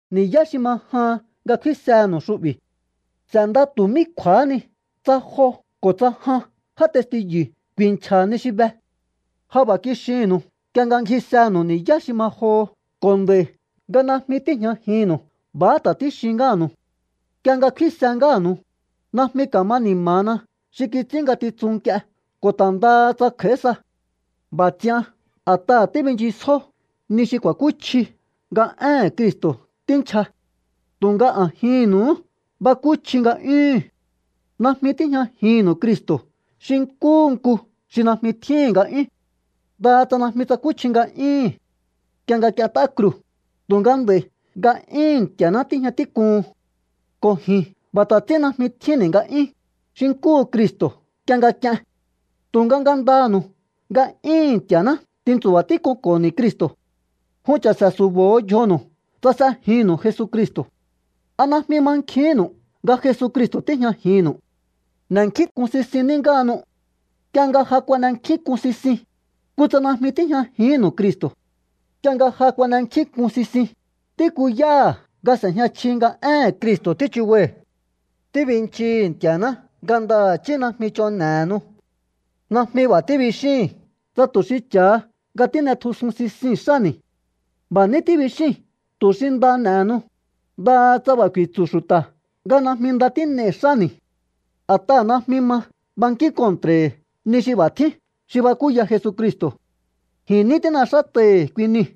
Ni̱yá xi ma jahan nga kfínsenu̱u xu'bi̱. S'e̱nda tu̱ mí kju̱a̱há ni tsa jo ko̱ tsa jan já testiyu̱ ku̱i̱nchja̱ ni xi be. Ja b'a̱ kixinnu̱u nk'ie nga ngjisenu̱u ni̱yá xi ma joho ko̱ nd'a̱i̱ nga najmi tíi̱jñajinnu̱u b'a̱há ta̱ tíxin ngáha̱nu̱u. Nk'ie nga kfínse ngáha̱nu̱u, najmi ka̱ma ni̱ma̱na xi kits'ín ngatitsun nk'ie ko̱ ta̱ ndaha tsa kj'a̱í sa. B'a̱ ts'ian a̱t'aha̱ tíbinchisjó ni xi ku̱a̱kúchji nga éhe̱n Cristo̱ tínchja. Tu̱nga a̱jinnu̱uhú bakúchji nga'yúhu̱n. Najmi tíjñajinnu̱u Cristo̱ xi nkúhu nku xi najmi tjíhi̱n nga'yún. Ndaha tsa najmi tsakúchji nga'yúhu̱n nk'ie nga k'ient'á kruu̱, tu̱nga nd'a̱i̱ nga'yúhu̱n Nti̱a̱ná tíjña tík'uhun. Ko̱ ji̱n b'a̱ ta̱ ts'ín najmi tjínni̱ nga'yún, xi nkúhu Cristo̱ nk'ie nga k'ien. Tu̱nga ngandanu̱u nga'yúhu̱n Nti̱a̱ná tintsu̱ba̱ tík'unko̱ho̱ni̱ Cristo̱. Jun cha̱se̱ su̱bo̱ho̱ yjonu̱u tsa s'ejinnu̱u Jesucristo̱. ¿A najmi mankjihínnu̱u nga Jesucristo̱ tíjñajinnu̱u? N'e̱nkjínk'un sisin ní ngáhanu. Nk'ie nga ja kuan'enkjínk'un sisin, kutsa najmi tíjñajihínnu̱u Cristo̱. Nk'ie nga ja kuan'enkjínk'un sisin, tíkuyáha̱ nga s'e̱jña chji nga éhe̱n Cristo̱ tíchubai̱. Tíbinchii̱hi̱ Nti̱a̱ná nga ndaha̱chí najmi ch'on n'e̱henu. Najmi b'a̱ tíbixíi̱n tsa tu̱ xi cha̱ha nga tín'etjusun sisii̱n xáni̱. B'a̱ ní tíbixíi̱n tu̱ xi nda n'e̱henu, ndaha tsa b'a̱ ku̱i̱tsu̱ xu̱ta̱ nga najmi nda tín'ei̱ xáni̱. A̱t'aha̱ najmi ma bankín kontra̱i̱hi̱ ni xi b'a̱ tjín xi bakúya Jesucristo̱. Ji̱n ní tín'exát'ai̱hi̱ kui niu̱.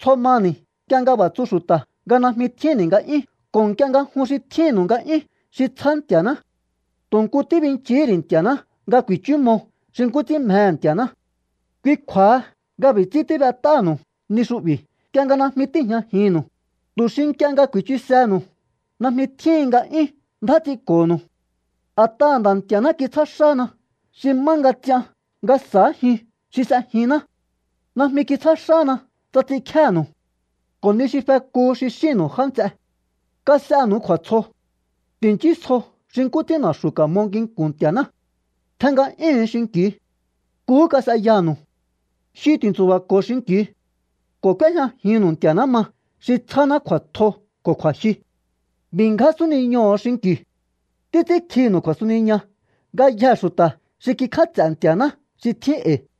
Tsjo mani̱ nk'ie nga b'a̱ tsu xu̱ta̱ nga najmi tjínni̱ nga'yún ko̱ nk'ie nga jun xi tjínnu̱u nga'yún xi tsjá Nti̱a̱ná. Tu̱ nku tíbinchihí ri̱ Nti̱a̱ná nga ku̱i̱chúmo xi nkú ts'ín mjehe̱ Nti̱a̱ná. Kui kju̱a̱ha nga b'i̱ ts'ín tíb'et'áha̱nu̱u ni xu'bi̱ nk'ie nga najmi tíi̱jñajinnu̱u, tu̱ xi nk'ie nga ku̱i̱chusehe̱nu̱u najmi tjíhin nga 'yún ndjá ts'inko̱nu̱u. A̱t'aha̱ Nda̱ Nti̱a̱ná kitsjá xána xi má nga ts'ian nga sa̱ájiun xi s'ejinná. Najmi kitsjá xána tsa ts'inkjénu̱u. Ko̱ ni xi fekuhu xi xínnu̱u, já nts'e, kas'enu̱u kju̱a̱tsjo. Ti̱nchísjo xi nkú ts'ín na̱xu̱ ka̱mo nginku̱n Nti̱a̱ná. Tjen nga'yúhu̱un xinki̱u. Nkuhú kas'eyanu̱u. Jyu ti̱ntsu̱ba̱ko̱o xinki̱u. Ko̱ k'úéjñajinnu̱u Nti̱a̱ná ma xi tsjáná kju̱a̱tjo ko̱ kju̱a̱jyu. B'i̱ ngján súniñoho̱o xinki̱u. Títs'ínkjinu̱u kju̱a̱suniña ngayjee̱ xu̱ta̱ xi kikj'áts'e̱ Nti̱a̱ná xi tjín e̱i̱.